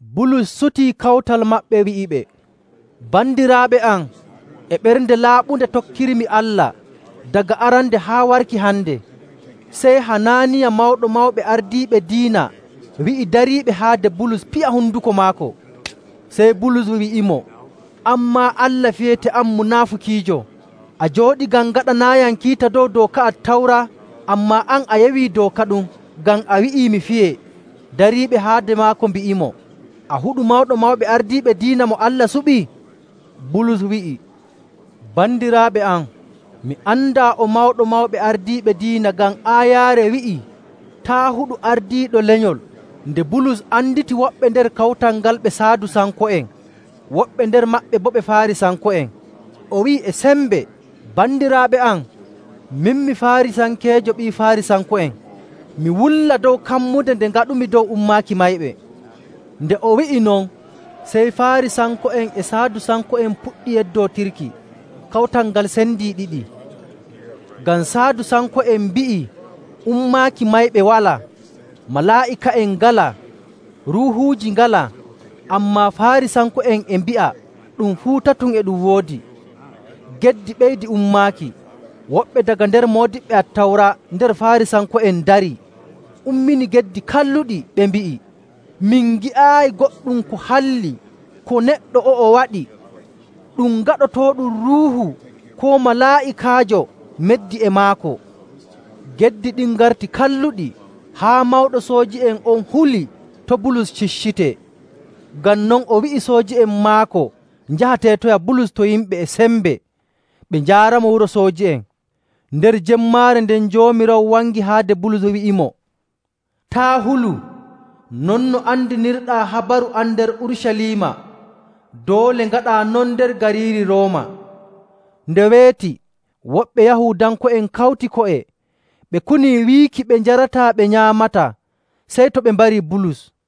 Bulus sutii Kawtal Mawɓe, wi'iɓe, “Bandiraaɓe am, e ɓernde laaɓunde tokkirmi Allah daga arande haa warki hande.” Sey Hanaaniya, Mawɗo Mawɓe Ardiiɓe Diina wi'i dariiɓe haade Bulus piya honduko maako. Sey Bulus wi'imo, “An maa Allah fiyete, an munaafukiijo! A jooɗi ngam ngaɗanaayam kiita dow dooka Attawra, ammaa an a yewii dooka ɗum ngam a wi'i mi fiyee.”. Dariiɓe haade maako mbi'imo, “A huɗu Mawɗo Mawɓe Ardiiɓe Diina mo Allah suɓi?” Bulus wi'i, “Bandiraaɓe am, mi andaa o Mawɗo Mawɓe Ardiiɓe Diina, ngam aayaare wi'ii, ‘Taa' huɗu ardiiɗo lenyol!’”. Nde Bulus anditi woɓɓe nder kawtal ngal ɓe Saadusanko'en, woɓɓe nder maɓɓe boo ɓe Faarisanko'en, o wi'i e sembe, “Bandiraaɓe am, min mi Faarisankeejo, ɓii Faarisanko'en. Mi wulla dow kammunde nde ngoodumi dow ummaaki mayɓe.”. Nde o wi'i non, sey Faarisanko'en e Saadusanko'en puɗɗi yeddootirki. Kawtal ngal sendii ɗiɗi, ngam Saadusanko'en mbi'i ummaaki mayɓe walaa, malaa'ika'en ngalaa, ruuhuuji ngalaa, ammaa Faarisanko'en e mbi'a ɗum fuu tatum e ɗum woodi.. Geddi ɓeydi ummaaki. Woɓɓe daga nder moodiɓɓe Attawra nder Faarisanko'en ndari, ummini geddi kalluɗi, ɓe mbi'i, “Min ngi'aayi goɗɗum ko halli ko neɗɗo o'o waɗi. Ɗum gaɗotooɗum ruuhu koo malaa'ikaajo meddii e maako!” Geddi ɗin ngarti kalluɗi haa mawɗo sooji'en on huli to Bulus ciccitee. Ngam non o wi'i sooji'en maako njaha teetoya Bulus to yimɓe e sembe, ɓe njaaramo wuro sooji'en. Nder jemmaare nden Joomiraawo wangi haade Bulus, wi'imo, “Taa' hulu! Non no andinirɗaa habaru am nder Urucaliima, doole ngaɗaa non nder gariiri Rooma.” Nde weeti, woɓɓe Yahuudanko'en kawti ko'e, ɓe kunii wiiki ɓe njarataa ɓe nyaamataa sey to ɓe mbarii Bulus.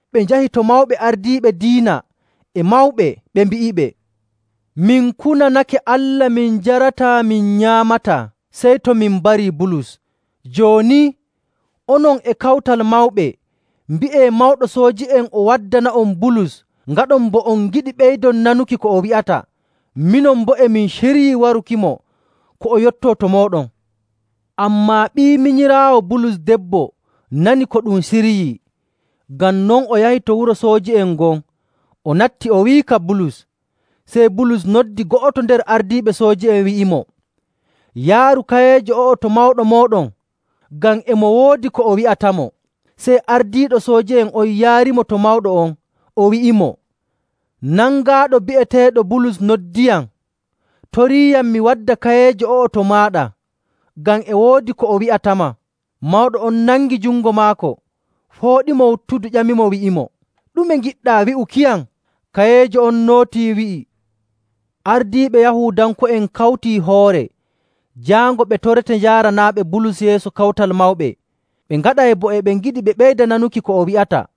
Ɓe njahi to mawɓe ardiiɓe diina e mawɓe, ɓe mbi'iɓe, “Min kunanake Allah min njarataa min nyaamataa, sey to min mbarii Bulus. Jooni, onon e Kawtal Mawɓe, mbi'ee mawɗo sooji'en o waddana'on Bulus, ngaɗon bo on ngiɗi ɓeydon nanuki ko o wi'ata. Minon boo, e min ciryii warukimo ko o yottoo to mooɗon.” Ammaa ɓii minyiraawo Bulus debbo nanii ko ɗum ciryii. Ngam non o yahi to wuro sooji'en ngon, o natti, o wi'ika Bulus. Sey Bulus noddi go'oto nder ardiiɓe sooji'en, wi'imo, “Yaaru kayeejo o'o to mawɗo mooɗon, ngam e mo woodi ko o wi'atamo.” Sey ardiiɗo sooji'en on yaarimo to mawɗo on, o wi'imo, “Nangaaɗo bi'eteeɗo Bulus noddiyam, toriiyam mi wadda kayeejo o'o to maaɗa, ngam e woodi ko o wi'atama.” Mawɗo on nangi jungo maako, fooɗimo wuttudu, ƴamimo, wi'imo, “Ɗume ngiɗɗaa wi'ukiyam?” Kayeejo on nootii, wi'i, “Ardiiɓe Yahuudanko'en kawtii hoore jaango ɓe torete njaaranaaɓe Bulus yeeso Kawtal Mawɓe, ɓe ngaɗay bo e ɓe ngiɗi ɓe ɓeyda nanuki ko o wi'ata.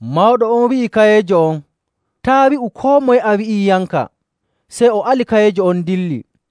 Mawɗo on wi'i kayeejo on, “Taa' wi'u koo moye a wi'iiyamka.” Sey o ali kayeejo on dilli.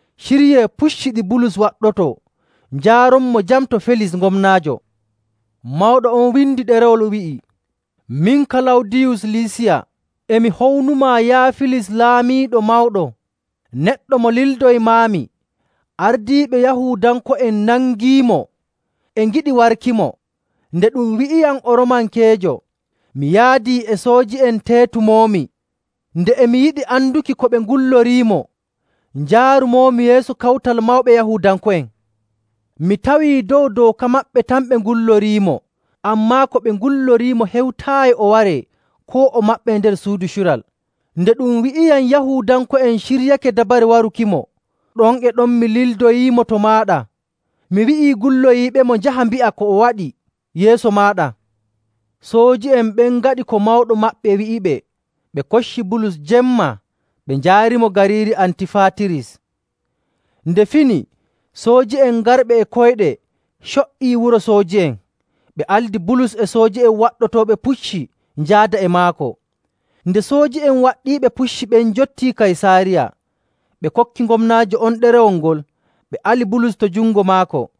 Ciryee pucci ɗi Bulus waɗɗotoo njaaronmo jam to Felis gomnaajo.” Mawɗo on windi ɗerewol, wi'i, “Min, Kalawdiyus Lisiya, e mi hownumaa, yaa Felis, laamiiɗo mawɗo. Neɗɗo mo lildoymaami, ardiiɓe Yahuudanko'en nangiimo, e ngiɗi warkimo. Nde ɗum wi'iyam o Roomankeejo, mi yaadii e sooji'en, teetumoomi. Nde e mi yiɗi anduki ko ɓe ngulloriimo, njaarumoomi yeeso Kawtal Mawɓe Yahuudanko'en. Mi tawii dow dooka maɓɓe tan ɓe ngulloriimo, ammaa ko ɓe ngulloriimo hewtaayi o waree koo o maɓɓee nder suudu cural. Nde ɗum wi'iyam Yahuudanko'en ciryake dabare warukimo, ɗon e ɗon mi lildoyiimo to maaɗa. Mi wi'i gulloyiiɓemo njaha mbi'a ko o waɗi yeeso maaɗa.” Sooji'en ɓen ngaɗi ko mawɗo maɓɓe wi'iɓe, ɓe kocci Bulus jemma, ɓe njaarimo gariiri Antifaatiris. Nde fini, sooji'en garɓe e koyɗe co''ii wuro sooji'en. Ɓe aldi Bulus e sooji'en waɗɗotooɓe pucci njaada e maako. Nde sooji'en waɗɗiiɓe pucci ɓen njottii Kaysaariya, ɓe kokki gomnaajo on ɗerewol ngol, ɓe ali Bulus to jungo maako.